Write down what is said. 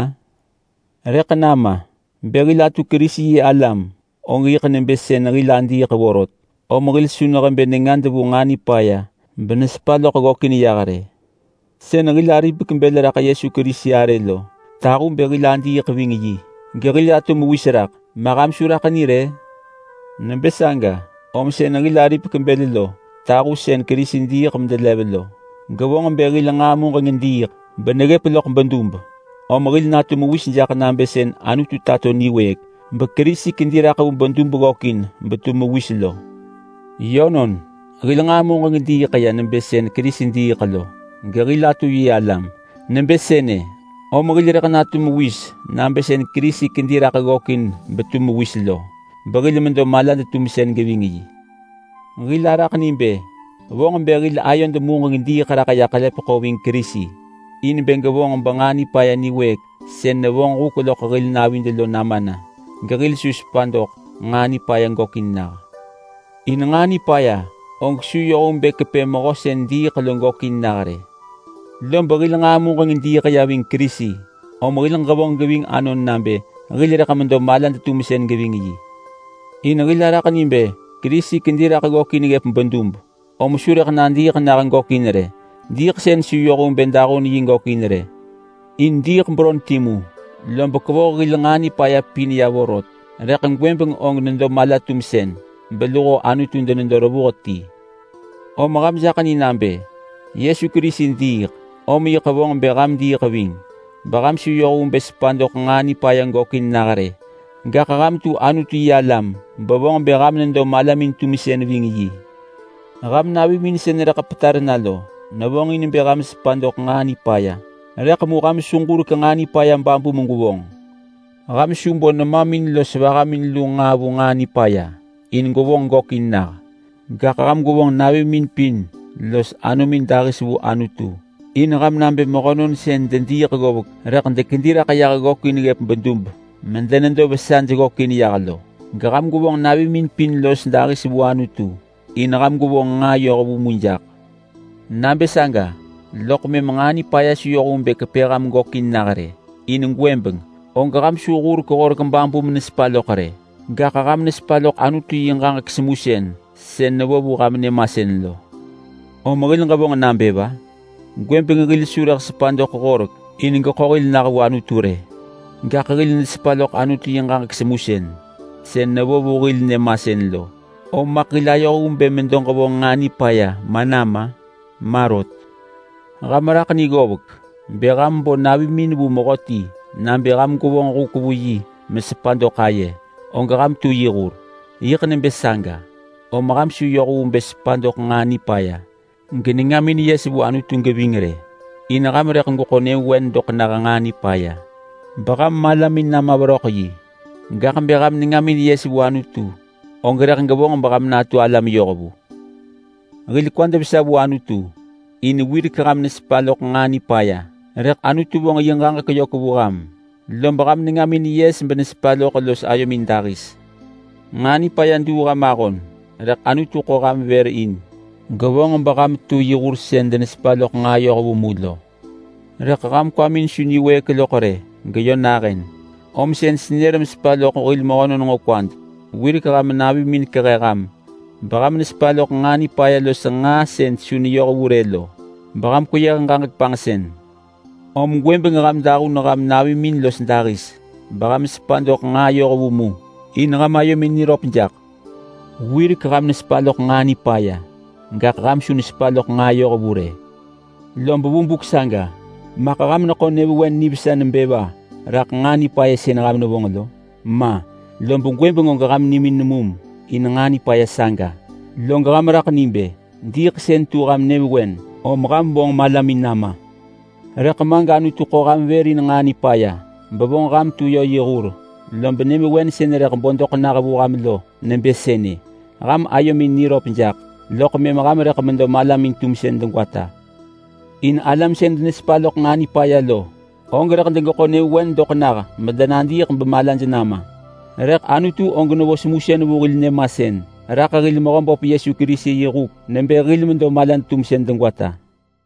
Ma! Rëḳ nama! Bë hil atu Kerisi-yi-alam, og yiḳ nebë sën hil adiiḳ vorot, om hil su nehebë nengad vu nġaa nipaya benesepa loḳ ggökin yah rë. Sën hil aripek bël raḳ Yesu Kerisi arë lo tahu bë hil adiiḳ ving yi gehil atu mewis raḳ. Ma ham su raḳ ni rë? Nebë saga, om sën hil aripek bël lo tahu sën Kerisi diiḳ medelev lo, gevonġ bë hil nġaa muġeng diiḳ beneggëp loḳ söv. Om hil natu mewis jaḳ nabë sën Anutu tato niwëëk beKerisi kedi raḳ vu bedub ggökin betu mewis lo. Yönon! Hil nġaa muġeng diiḳ ya nebë sën Kerisi diiḳ lo gehil atu yi alam. Nebë sënë, om hil rëḳ natu mewis nabë sën Kerisi kedi raḳ ggökin betu mewis lo, behil medo malad-tumsën geving yi. Hil araḳ ni bë vonġ bë hil ayod muġeng diiḳ ya raḳ ḳelepeḳo ving Kerisi in bë gevonġ benġaa nipaya niwëëk sën nevonġ huk loḳ hil navid lo nama na, in hil su sepa doḳ nġaa nipaya gökin nah. In nġaa nipaya og su yoh vu bë kepë mehö sën diiḳ lo gökin nah rë. Lob hil nġaa muġeng diiḳ ya ving Kerisi, om hil ġevonġ geving anon nabë hil rëḳ medo malad-tumsën geving yi. In hil araḳ ni bë Kerisi kedi raḳ ggökin ggëp bedub, om su rëḳ nadiiḳ nah gökin rë. Diiḳsën su yoh vu bë dahun yi gökin rë. In diiḳ beron timu, lob kevoh hil nġaa nipaya pin ya vorot. Rëḳ gwëbeng og nedo mala-tumsën beluho Anutu denedo revuh ti. Om ham jak ni rë nabë Yesu Kerisi diiḳ, om yiḳ vonġ bë ham diiḳ ving beham su yoh vu bë sepa doḳ nġaa nipaya gökin nah rë. Gaḳ ham tu Anutu-yi-alam bevonġ bë ham nedo malamin-tumsën ving yi. Ham navimin sën rëḳ petar na lo nevonġin bë ham sepa doḳ nġaa nipaya, rëḳ mu ham su ġurek nġaa nipaya babu megwevonġ. Ham su bo nemamin los vahamin lu nġaa vu nġaa nipaya in gwevonġ nġaa nipaya gökin nah. Gaḳ ham gwevonġ navimin pin los anomin dahis vu Anutu in ham nabë mehönon sën dediiḳ ggovek rëḳ dekedi raḳ ggökin ggëp bedub medenedo vesaj ggökin yah lo. Geham gwevonġ navimin pin los dahis vu Anutu in ham gwevonġ nġaa yohvu mu jaḳ. Nabë saga loḳ mëm nġaa nipaya su yoh vu bë kepë ham gökin nah rë. In gwëbeng og ham su hurek horek babu menesepa loḳ rë, gaḳ ham nesepa loḳ Anutu yi ġaġek semusën sën nevo vu ham nyëmasën lo. Om hil ġevonġ nabë va? Gwëbeng hil su rëḳ sepa doḳ horek in geḳo hil nah vu Anutu rë, gaḳ hil nesepa loḳ Anutu yi ġaġek semusën sën nevo vu hil nyëmasën lo. Om maḳ hil ayoh vu bë medo ġevonġ nġaa nipaya ma nama? Ma rot! Ham raḳ ni ggovek! Bë ham bo navimin vu mehöti nabë ham gwevonġ huk vu yi megwevonġ noh vu aye, og ham tu yi hur. Yiḳ nebë saga, om ham su yoh vu bë sepa doḳ nġaa nipaya genengamin yes vu Anutu geving rë. In ham rëḳ gweḳo nyëvewen doḳ nah nġaa nipaya beham malamin nama veröḳ yi. Gaḳ bë ham nengamin yes vu Anutu, og rëḳ gevonġ beham natu alam yohvu. Hil kwad vesa vu Anutu in wirek ham nesepa loḳ nġaa nipaya, rëḳ Anutu vonġ yi ġaġek yök vu ham, lob ham nengamin yes benesepa loḳ los ayomin dahis. Nġaa nipaya duu ham ahon rëḳ Anutu ḳo ham vër in, gevonġ beham tu yi hur sën denesepa loḳ nġaa yohvu mu lo. Rëḳ ham kwamin su niwëëk loḳ rë geyö nahën, om sën senër mesepa loḳ hil mehönon nġo kwad. Wirek ham navimin kehe ham beham nesepa loḳ nġaa nipaya los nġaa sën su neyoh vu rë lo beham kweyëh ġaġek panġsën. Om gwëbeng ham dahun ham navimin los dahis, beham sepa doḳ nġaa yohvu mu in ham ayomin niröp jaḳ. Wirek ham nesepa loḳ nġaa nipaya, gaḳ ham su nesepa loḳ nġaa yohvu rë. Lob vu buk saga maḳ ham neḳo nyëvewen nivesa nebë va raḳ nġaa nipaya sën ham nevonġ lo? Ma! Lob gwëbeng og ham nimin nemum in nġaa nipaya saga, log ham raḳ ni bë diiḳsën tu ham nyëvewen om ham vonġin malamin nama! Rëḳ ma gAnutu ḳo ham vër in nġaa nipaya bevonġ ham tu yö yi hur. Lob nyëvewen sën rëḳ bo doḳ nah vu ham lo nebë sënë: Ham ayomin niröp jaḳ, loḳ mëm ham rëḳ medo malamin-tumsën degwata. In alam sën denesepa loḳ nġaa nipaya lo, og rëḳ degeḳo nyëvewen doḳ nah medenadiiḳ bemalaj nama. Rëḳ Anutu og nevo semusën vu hil nyëmasën raḳ hil Mehöböp Yesu Kerisi yi huk nebë hil medo malad-tumsën degwata.